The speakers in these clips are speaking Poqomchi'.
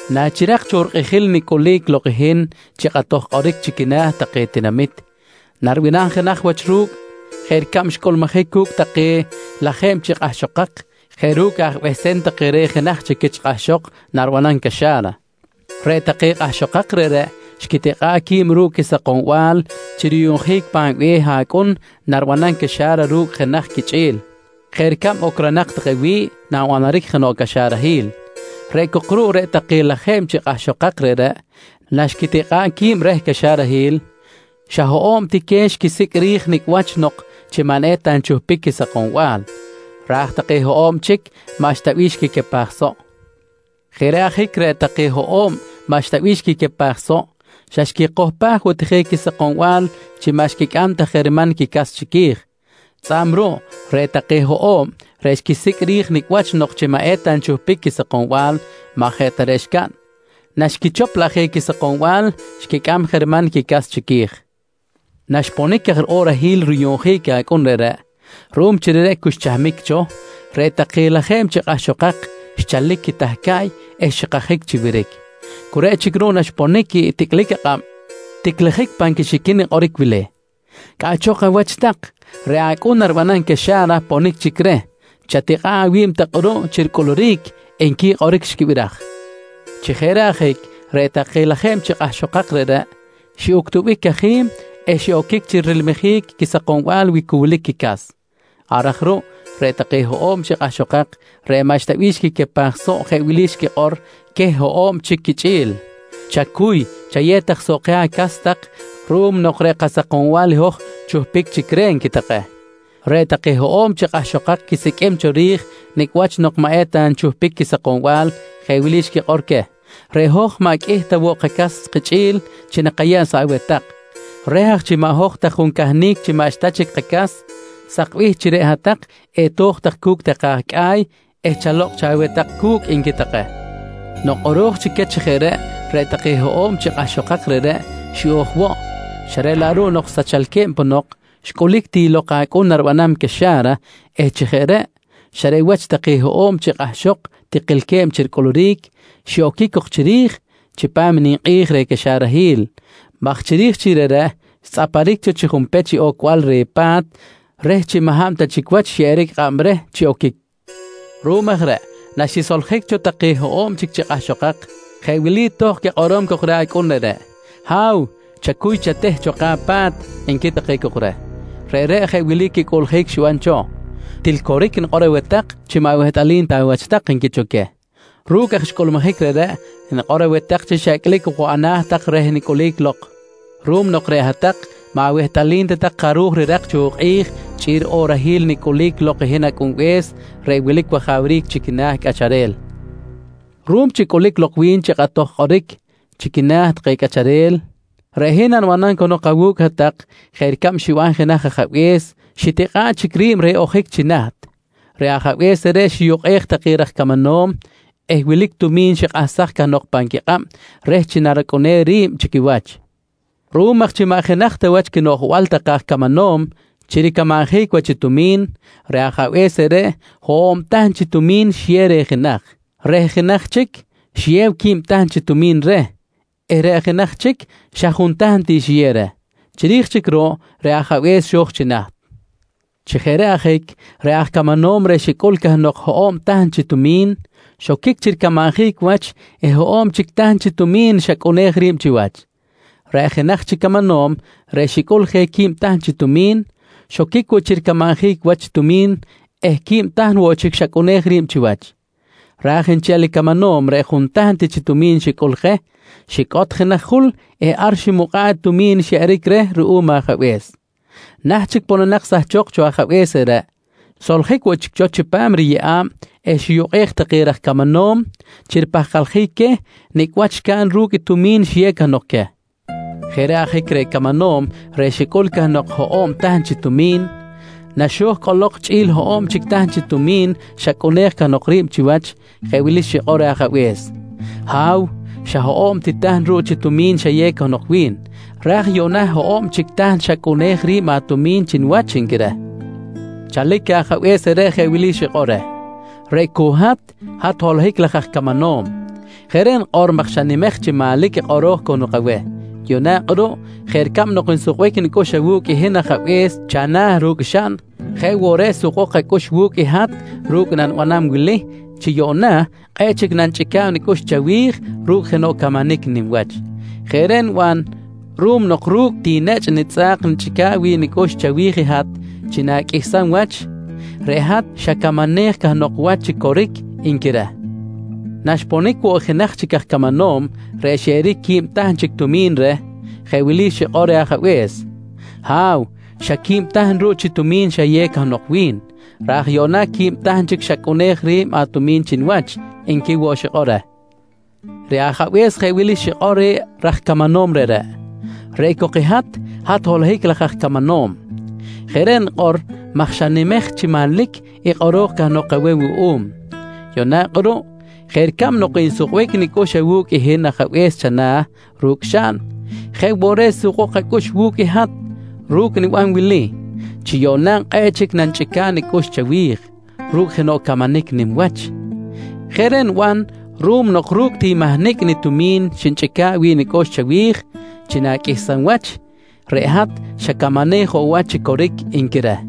«Nachirak cho rikꞌijil nicꞌulic lok i hin chi kꞌatoj kꞌoric chi quina̱ take tinamit, naribanam jenaj wach ru̱cꞌ jeꞌ ricab xcꞌulmujic cu̱cꞌ take lajeb chi kꞌahxokak jeꞌ ru̱cꞌ aj behsem take reh jenaj quich kꞌahxok naribanam caxa̱ra. Reꞌ take kꞌahxokak reꞌreꞌ xquitikꞌa̱ꞌ qui̱b ru̱cꞌ quisakombal chi ruyuꞌnjic pan be̱h acꞌun naribanam caxa̱ra ru̱cꞌ jenaj quichꞌi̱l, jeꞌ ricab ocronak take wi̱ꞌ nanbanaric jenoꞌ caxarahil. Reꞌ cok ruꞌ, reꞌ take lajeb chi kꞌahxokak reꞌreꞌ na xquitikꞌa̱ꞌ qui̱b reh caxarahil, xa hoꞌo̱b ti queh xquisicꞌ ri̱j nicꞌ wach nok chi maꞌ eta nchuhpic quisakombal, raj take hoꞌo̱b chic maꞌxta bih xquicapaj soꞌ. Jeꞌ reꞌ ajic reꞌ take hoꞌo̱b maꞌxta bih xquicapaj soꞌ, xa xquichohpaj woꞌ ti je i quisakombal chi maꞌ xquicꞌam ta je riman quicas chiqui̱j. Tzꞌa̱b ruꞌ, reꞌ take hoꞌo̱b reꞌ xquisicꞌ ri̱j nicꞌ wach nok chi maꞌ eta nchuhpic quisakombal, maꞌ jeꞌ ta reꞌ xcaꞌn, naxquichop laꞌ je quisakombal xquicꞌam je riman quicas chiqui̱j. Naxponic aj riꞌorahil ruyuꞌnjic acꞌun reꞌreꞌ, ruꞌum chi reꞌreꞌ cu xchahmic cho, reꞌ take lajeb chi kꞌahxokak xchalic quitahcaꞌy eh xikajic chi wiric. Cu reꞌ chic ruꞌ naxponic ticꞌlic akꞌab, ticlijic pan quixiquin i kꞌoric wili: ‹Cꞌaꞌchok awach tak, reꞌ acꞌun naribanam caxa̱ra ponic chic reh. Chatikꞌa̱ꞌ awi̱b tak kꞌuruꞌ chi ricꞌuluric, nqui kꞌoric xquibiraj. «Chi jeꞌ reꞌ ajic, reꞌ take lajeb chi kꞌahxokak reꞌreꞌ xiꞌuctubic cajim eh xiꞌoquic chi rilmijic i quisakombal wi cu wilic quicas. Ar aj ruꞌ, reꞌ take hoꞌo̱b chi kꞌahxokak reꞌ maꞌxta bih xquicapaj soꞌ, jeꞌ wili xquikꞌor queh hoꞌo̱b chic quichꞌi̱l: ‹Chacuy chayew tak soꞌ keh acas tak ruꞌum nok reꞌ kasakombal i hoj chuhpic chic reh, nqui take. «Reꞌ take hoꞌo̱b chi kꞌahxokak quisiqꞌuim cho ri̱j nicꞌ wach nok chi maꞌ eta nchuhpic quisakombal, jeꞌ wili xquikꞌor queh: ‹Reꞌ hoj maꞌ qꞌuih ta woꞌ kacas kichꞌi̱l chi nakayeb soꞌ aweh tak. Reh aj chi maꞌ hoj ta juncahnic chi maꞌxta chic kacas, sakbih chi reꞌ hat-tak eto̱j tak cu̱cꞌ take aj cꞌa̱y eh chalokꞌ cho aweh tak cu̱cꞌ, nqui take. «Nok kꞌoro̱j chic queh chi jeꞌ reꞌ, reꞌ take hoꞌo̱b chi kꞌahxokak reꞌreꞌ xiꞌo̱j woꞌ, xa reꞌ laꞌ ruꞌ nok sachalque̱b ponok, xcꞌulic ti lok i acꞌun naribanam caxa̱ra eh chi jeꞌ reꞌ, xa reꞌ wach take hoꞌo̱b chi kꞌahxok tikilque̱b chi ricꞌuluric, xiꞌoquic cok chiri̱j chipam i ninkꞌi̱j reh ricaxarahil maj chiri̱j chic reꞌreꞌ, xtzꞌaparic cho chi junpech i ocbal reh pa̱t reh chi maꞌ hab ta chic wach xyeꞌeric kꞌab reh chi oquic. «Ruꞌum aj reꞌ, naxisoljic cho take hoꞌo̱b chic chi kꞌahxokak, jeꞌ wili tohkꞌ quikꞌorom cok reh acꞌun reꞌreꞌ: ‹Ha̱w, chacuy chateh cho keh apa̱t, nqui take cok reh. Reꞌreꞌ jeꞌ wili quicꞌuꞌljic xiban take cho: ‹Til coric nikꞌor aweh tak chi maꞌ wehtꞌalim ta awach tak, nqui cho queh. «Ru̱cꞌ aj xcꞌulmujic reꞌreꞌ, nikꞌor aweh tak chi xa icꞌlic ok woꞌ ana̱ tak reh nicꞌulic lok ruꞌum nok reꞌ hat-tak maꞌ awehtꞌalim ta tak jaruj rirak cho i kꞌi̱j chꞌi̱l riꞌorahil nicꞌulic lok i hin Acꞌunbe̱s reꞌ wilic wajawric chi quina̱ cꞌacharel. «Ruꞌum chi cꞌulic lok wi̱n chi kꞌatoj kꞌoric chi quina̱ take cꞌacharel, reꞌ hin nanibanam cahnok awu̱cꞌ hat-tak jeꞌ ricab xiban jenaj ajabe̱s xitikꞌa̱ꞌ chic ri̱b chi ojic reh chi naht. Reꞌ ajabe̱s reꞌreꞌ xiyukꞌej take raj camanom eh wilic tumi̱n xikꞌahsaj cahnok pan quikꞌab reh chi naracꞌunem ri̱b chi quiwach. Ruꞌum aj chi maꞌ jenaj ta wach quinoꞌjbal take aj camanom chi ricamanjic wach tumi̱n, reꞌ ajabe̱s reꞌreꞌ, hoꞌo̱b tahn chi tumi̱n xiyew reh jenaj. Reh jenaj chic, xiyew quib tahn chi tumi̱n reh eh reꞌ jenaj chic xa juntahn ti xiyew reh. Chiri̱j chic ruꞌ, reꞌ ajabe̱s xo̱j chi naht. Chi jeꞌ reꞌ ajic, reꞌ aj camanom reꞌ xicꞌul cahnok hoꞌo̱b tahn chi tumi̱n, xoquic chi ricamanjic wach eh hoꞌo̱b chic tahn chi tumi̱n xacꞌunej ri̱b chiwach. Reꞌ jenaj chic camanom reꞌ xicꞌul je quib tahn chi tumi̱n, xoquic woꞌ chi ricamanjic wach tumi̱n eh quib tahn woꞌ chic xacꞌunej ri̱b chiwach, raj nchel i camanom reꞌ juntahn ti chi tumi̱n xicꞌul je, xicꞌot jenaj jul eh ar ximukꞌa̱ꞌ i tumi̱n xyeꞌeric reh ruꞌum ajabe̱s. Naht chic pononak sahchok cho ajabe̱s reꞌreꞌ, xsoljic woꞌ chic cho chipam riyeꞌa̱b eh xiyukꞌej take raj camanom chi ripahkaljic queh nicꞌ wach xcaꞌn ru̱cꞌ i tumi̱n xiyew cahnok queh. Jeꞌ reꞌ ajic, reꞌ camanom reꞌ xicꞌul cahnok i hoꞌo̱b tahn chi tumi̱n, naxo̱j cꞌolok chꞌi̱l hoꞌo̱b tahn chic chi tumi̱n xacꞌunej cahnok ri̱b chiwach, jeꞌ wili xikꞌor reh ajabe̱s: ‹Ha̱w, xa hoꞌo̱b ti tahn ruꞌ chi tumi̱n xayew cahnok wi̱n, raj yuꞌna hoꞌo̱b chic tahn xacꞌunej ri̱b atumi̱n chi niwach, nqui reh. «Chalic ajabe̱s reꞌreꞌ jeꞌ wili xikꞌor reh: ‹Reꞌ cok hat, hat holohic laj aj camanom. Jeꞌ reꞌ nikꞌor maj xanimej chi manlic i kꞌoro̱j cahnok aweh. Yuꞌna kꞌuruꞌ, jeꞌ ricab nok nsukbic nicꞌux awu̱cꞌ i hin ajabe̱s chana̱ ru̱cꞌ xaꞌn, jeꞌ woꞌ reꞌ sukbok acꞌux wu̱cꞌ i hat ru̱cꞌ i nanibanam wili chi yuꞌna kꞌe̱ꞌ chic nanichꞌica̱b nicꞌux chawi̱j ru̱cꞌ jenoꞌ camanic nim wach. Jeꞌ reꞌ niban ruꞌum nok ru̱cꞌ ti nechꞌ nitzꞌa̱k xnichꞌica̱ꞌ wi̱ꞌ nicꞌux chawi̱j i hat chi na̱qꞌuihsam wach, reꞌ hat xacamanej cahnok wach chi coric, nqui reh. «Naxponic woꞌ i jenaj chic aj camanom reꞌ xyeꞌeric quib tahn chic tumi̱n reh, jeꞌ wili xikꞌor reh ajabe̱s: ‹Ha̱w, xa qui̱b ti tahn ruꞌ chi tumi̱n xayew cahnok wi̱n, raj yuꞌna qui̱b chic tahn xacꞌunej ri̱b atumi̱n chi niwach, nqui woꞌ xikꞌor reh. «Reꞌ ajabe̱s jeꞌ wili xikꞌor reh raj camanom reꞌreꞌ: ‹Reꞌ cok i hat, hat holohic laj aj camanom. Jeꞌ reꞌ nikꞌor maj xanimej chi manlic i kꞌoro̱j cahnok aweh wuꞌum. Yuꞌna kꞌuruꞌ, jeꞌ ricab nok nsukbic nicꞌux awu̱cꞌ i hin ajabe̱s chana̱ ru̱cꞌ xaꞌn, jeꞌ woꞌ reꞌ sukbok acꞌux wu̱cꞌ i hat ru̱cꞌ i niban wili chi yuꞌna kꞌe̱ꞌ chic nanichꞌica̱b nicꞌux chawi̱j ru̱cꞌ jenoꞌ camanic nim wach. Jeꞌ reꞌ niban ruꞌum nok ru̱cꞌ ti mahnicꞌ nitumin xnichꞌica̱ꞌ wi̱ꞌ nicꞌux chawi̱j chi na̱qꞌuihsam wach, reꞌ hat xacamanej woꞌ wach chi coric, nqui reh.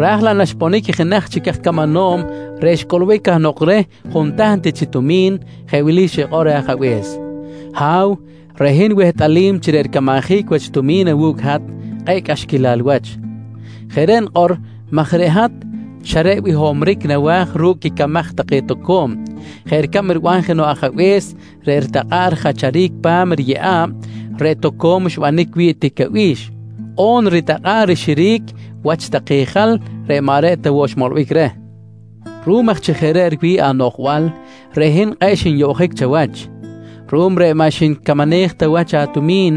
«Raj laꞌ naxponic i jenaj chic aj camanom reꞌ xcꞌulbic cahnok reh juntahn ti chi tumi̱n, jeꞌ wili xikꞌor reh ajabe̱s: ‹Ha̱w, reꞌ hin wehtꞌalim chi reꞌ ricamanjic wach tumi̱n awu̱cꞌ i hat kꞌe̱ꞌ cꞌaxquilal wach. Jeꞌ reꞌ nikꞌor maj reꞌ hat xa reꞌ bihomric nawa̱j ru̱cꞌ quicamaj take toco̱m jeꞌ ricab riban jenoꞌ ajabe̱s reꞌ ritakꞌa̱ꞌ rijacharic pa̱m riyeꞌa̱b reꞌ toco̱m xbanic wi̱ꞌ tic abi̱x on ritakꞌa̱ꞌ rixiric wach take jal reꞌ maꞌ reꞌ ta woꞌ xmolbic reh. Ruꞌum aj chi jeꞌ reꞌ riwi̱ꞌ anoꞌjbal, reꞌ hin kꞌe̱ꞌ xinyoꞌjic chawach, ruꞌum reꞌ maꞌ xnicamanej ta wach atumi̱n,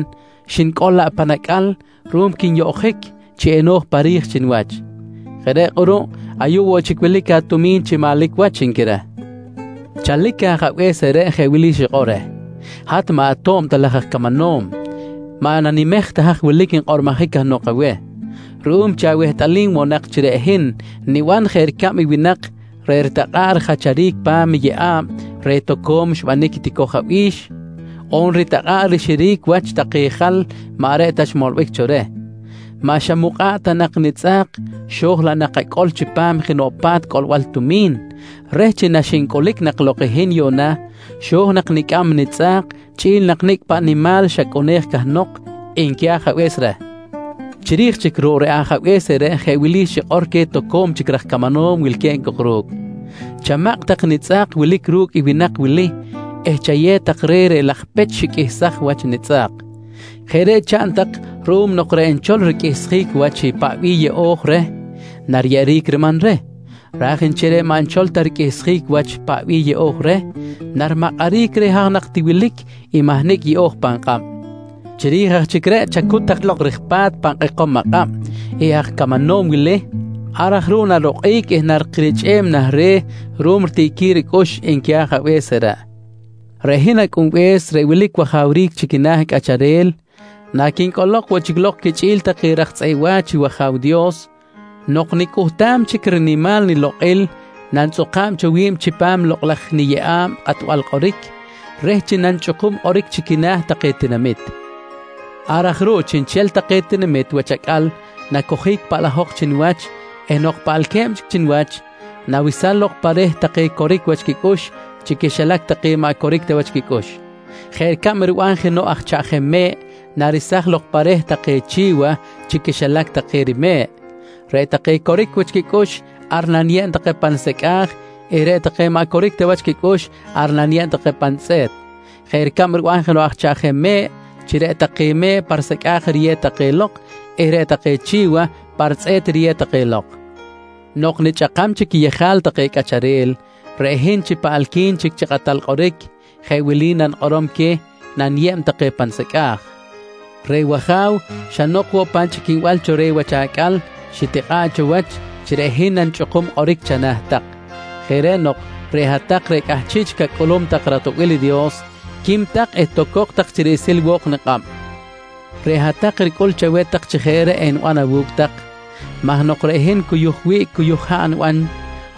xnicꞌol laꞌ pan acꞌal ruꞌum quinyoꞌjic chi eno̱j pa ri̱j chi niwach. Jeꞌ reꞌ kꞌuruꞌ, ayuꞌ wilic woꞌ chic atumi̱n chi manlic wach, nqui reh. «Chalic ajabe̱s reꞌreꞌ, jeꞌ wili xikꞌor reh: ‹Hat maꞌ ato̱b ta laj aj camanom, maꞌ nanimej ta haj wilic nkꞌormojic cahnok aweh. Ruꞌum chi awehtꞌalim woꞌ nak chi reꞌ hin niban jeꞌ ricab i winak reꞌ ritakꞌa̱ꞌ rijacharic pa̱m i yeꞌa̱b reꞌ toco̱m xbanic i ticoj abi̱x on ritakꞌa̱ꞌ rixiric wach take jal maꞌ reꞌ ta xmolbic cho reh, maꞌ xamukꞌa̱ꞌ ta nak i nitzꞌa̱k xo̱j laꞌ nak acꞌol chipam jenoꞌ pa̱t cꞌolbal tumi̱n reh chi naxincꞌulic nak lok i hin yuꞌna xo̱j nak nicꞌam i nitzꞌa̱k chꞌi̱l i nicꞌ paꞌ nak nimal xacꞌunej cahnok, nqui ajabe̱s reh. «Chiri̱j chic ruꞌ, reꞌ ajabe̱s reꞌreꞌ jeꞌ wili xikꞌor queh toco̱m chic raj camanom wilque̱b cok ru̱cꞌ: ‹Chamakꞌ tak i nitzꞌa̱k wilic ru̱cꞌ i winak wili eh chayew tak reh reꞌ laj pech xiqꞌuihsaj wach nitzꞌa̱k. Jeꞌ reꞌ chaꞌn tak ruꞌum nok reꞌ nchol riqꞌuihsjic wach i paꞌ bih yeꞌo̱j reh nariyeꞌeric riman reh, ra̱j nchel reꞌ maꞌ nchol ta riqꞌuihsjic wach i paꞌ bih yeꞌo̱j reh, narimakꞌaric reh reꞌ haj nak ti wilic i mahnicꞌ yeꞌo̱j pan kꞌab. Chiri̱j aj chic reꞌ, chacut tak lok ri̱j pa̱t pan kꞌekom akꞌab i aj camanom wili, ar aj ruꞌ narokꞌic eh narikirichꞌem nah re̱ ruꞌum ritiꞌquil ricꞌux, nqui ajabe̱s reꞌreꞌ. «Reꞌ hin Acꞌunbe̱s reꞌ wilic wajawric chi quina̱ cꞌacharel, naquincꞌolok woꞌ chic lok quichꞌi̱l take raj tzꞌeꞌ wa̱ch i wAja̱w Dios, nok nicꞌuhtam chic i rinimal nilokꞌil, nanitzꞌuka̱b cho wi̱b chipam lokꞌ laj niyeꞌa̱b kꞌatbal kꞌoric reh chi nanichꞌukum kꞌoric chi quina̱ take tinamit. Ar aj ruꞌ, chiꞌnchel take tinamit wach acꞌal nacojic paꞌlajok chi niwach eh nok paꞌalque̱b chic chi niwach, nawesam lok pa reh take coric wach quicꞌux chi quixilac take maꞌ coric ta wach quicꞌux, jeꞌ ricab riban jenoꞌ aj chaꞌjem me̱ꞌ naresaj lok pa reh take chi̱wa chi quixilac take rime̱ꞌ. Reꞌ take coric wach quicꞌux, ar naniyeb take pa nisecꞌa̱j eh reꞌ take maꞌ coric ta wach quicꞌux ar naniyeb take pa nitzꞌe̱t, jeꞌ ricab riban aj chaꞌjem me̱ꞌ chi reꞌ take me̱ꞌ pa risecꞌa̱j riyew take lok eh reꞌ take chi̱wa pa ritzꞌe̱t riyew take lok. Nok nichꞌakam chic quiyejal take cꞌacharel, reꞌ hin chi paꞌalqui̱n chic chi kꞌatal kꞌoric, jeꞌ wili nanikꞌorom queh naniyeb take pa nisecꞌa̱j: ‹Reꞌ wAja̱w, xa nok woꞌ pan chꞌiquinbal cho reh wach acꞌal, xitikꞌa̱ꞌ cho wach chi reꞌ hin nanichꞌukuj kꞌoric chana̱ tak. Jeꞌ reꞌ nok, reꞌ hat-tak reꞌ cꞌahchiꞌ chic acꞌulum tak i ratoꞌbil i Dios, quim tak eh tocok tak chi riꞌsil wo̱k nikꞌab. Reꞌ hat-tak ricꞌul chaweh tak chi jeꞌ reꞌ eniban awu̱cꞌ tak maj nok reꞌ hin cuyuj wiꞌc cuyuj haꞌ niban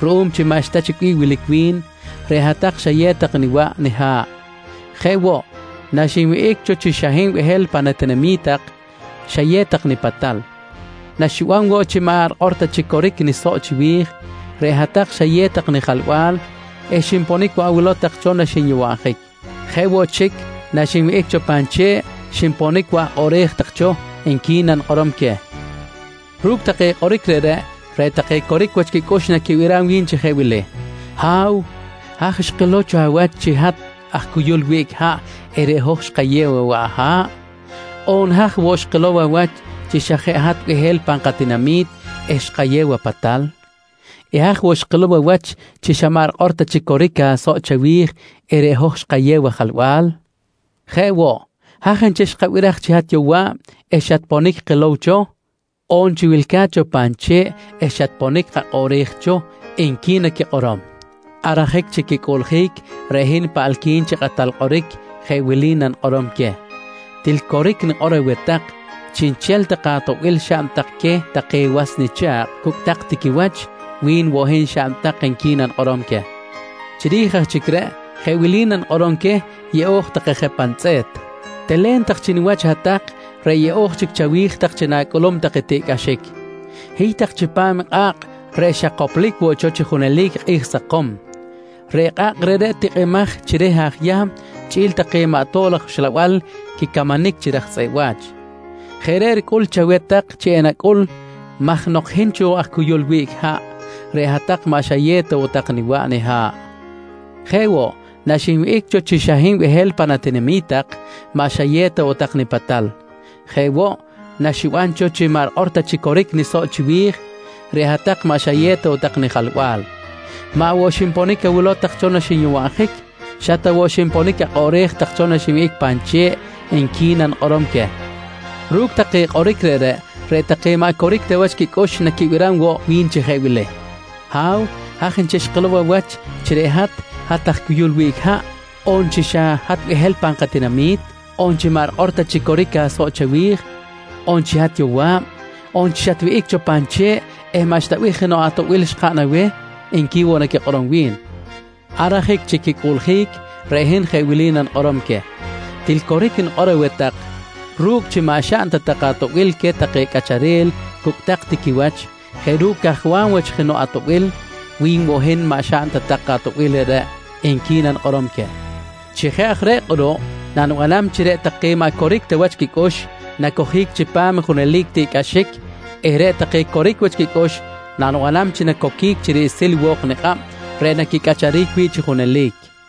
ruꞌum maꞌxta chic bih wilic wi̱n, reꞌ hat-tak xayew tak niwaꞌ niha̱ꞌ. Jeꞌ woꞌ, naxinwihꞌic cho chi xa hin behel pan atinami̱t tak xayew tak nipatal. Naxiban woꞌ cho chi maꞌ rikꞌor ta chic coric nisoꞌ chiwi̱j, reꞌ hat-tak xayew tak nijalba̱l eh xinponic woꞌ awilow tak cho naxinyowabjic. Jeꞌ woꞌ chic, na xinwihꞌic cho pan che̱ꞌ, xinponic woꞌ akꞌoꞌrej tak cho, nqui nanikꞌorom queh. «Ru̱cꞌ take kꞌoric reꞌreꞌ, reꞌ take coric wach quicꞌux naquibiram wi̱n chi jeꞌ wili: ‹Ha̱w, haj xkilow cho awach chi hat aj cuyul wiꞌc haꞌ eh reꞌ hoj xkayew awaꞌ aha̱ꞌ? On, haj woꞌ xkilow awach chi xa jeꞌ hat behel pan katinami̱t eh xkayew apatal? Eh haj woꞌ xkilow awach chi xa maꞌ rikꞌor ta chic coric asoꞌ chawi̱j eh reꞌ hoj xkayew ajalba̱l? Jeꞌ woꞌ, haj nchel xkabiraj chi hat yowa̱b eh xatponic kilow cho, on chi wilca̱t cho pan che̱ꞌ eh xatponic kakꞌoꞌrej cho? nqui naquikꞌorom. «Ar ajic chi quicꞌuꞌljic, reꞌ hin reꞌ paꞌalqui̱n chic chi kꞌatal kꞌoric jeꞌ wili nanikꞌorom queh: ‹Til coric nikꞌor aweh tak, chiꞌnchel take atoꞌbil xaꞌn tak queh take was nicha̱kꞌ cu̱cꞌ tak ti quiwach, wi̱n woꞌ hin xaꞌn tak, nqui nanikꞌorom queh. «Chiri̱j aj chic reꞌ, jeꞌ wili nanikꞌorom queh yeꞌo̱j take je pa nitzꞌe̱t: ‹Telen tak chi niwach hat-tak reꞌ yeꞌo̱j chic chawi̱j tak chi na̱cꞌulum tak i tiꞌcꞌaxic. Hiy tak chipam i kꞌa̱kꞌ reꞌ xa koplic woꞌ cho chi junelic i kꞌi̱j sakom. Reꞌ kꞌa̱kꞌ reꞌreꞌ tikꞌimaj chi reh aj Yahm chꞌi̱l take maꞌ tob laj uxlabal quicamanic chi raj tzꞌeꞌ wa̱ch. Jeꞌ reꞌ ricꞌul chaweh tak chi enacꞌul maj nok hin cho aj cuyul wiꞌc haꞌ, reꞌ hat-tak maꞌ xayew ta tak niwaꞌ niha̱ꞌ. Jeꞌ woꞌ, naxinwihꞌic cho chi xa hin behel pan atinami̱t tak, maꞌ xayew ta tak nipatal. Jeꞌ woꞌ, naxiban cho chi maꞌ rikꞌor ta chic coric nisoꞌ chiwi̱j, reꞌ hat-tak maꞌ xayew ta tak nijalba̱l. Maꞌ woꞌ, xinponic ta awilow tak cho naxinyowabjic. Xa ta woꞌ xinponic akꞌoꞌrej tak cho naxinwihꞌic pan che̱ꞌ, nqui nanikꞌorom queh. «Ru̱cꞌ take kꞌoric reꞌreꞌ, reꞌ take maꞌ coric ta wach quicꞌux naquibiram woꞌ wi̱n chi jeꞌ wili: ‹Ha̱w, haj nchel xkilow cho awach chi reꞌ hat, hat aj cuyul wiꞌc haꞌ? On chi xa jeꞌ hat behel pan katinami̱t? On chi maꞌ rikꞌor ta chic coric asoꞌ chawi̱j? On chi hat yowa̱b? On chi naxatwihꞌic cho pan che̱ꞌ eh maꞌxta bih jenoꞌ atoꞌbil xkaꞌn aweh? nqui woꞌ naquikꞌorom wi̱n. «Ar ajic chi quicꞌuꞌljic, reꞌ hin jeꞌ wili nanikꞌorom queh: ‹Til coric nikꞌor aweh tak ru̱cꞌ chi maꞌ xaꞌn ta tak atoꞌbil queh take cꞌacharel cucꞌtak ti quiwach jeꞌ ru̱cꞌ cajwam wach jenoꞌ atoꞌbil, wi̱n woꞌ hin maꞌ xaꞌn ta tak atoꞌbil reꞌreꞌ, nqui nanikꞌorom queh. «Chi jeꞌ aj reꞌ kꞌuruꞌ, nanibanam chi reꞌ take maꞌ coric ta wach quicꞌux nacojic chipam i junelic tiꞌcꞌaxic eh reꞌ take coric wach quicꞌux nanibanam chi nacoquic chi riꞌsil wo̱k nikꞌab reꞌ naquicꞌacharic wi̱ꞌ chi junelic, nqui Jesus.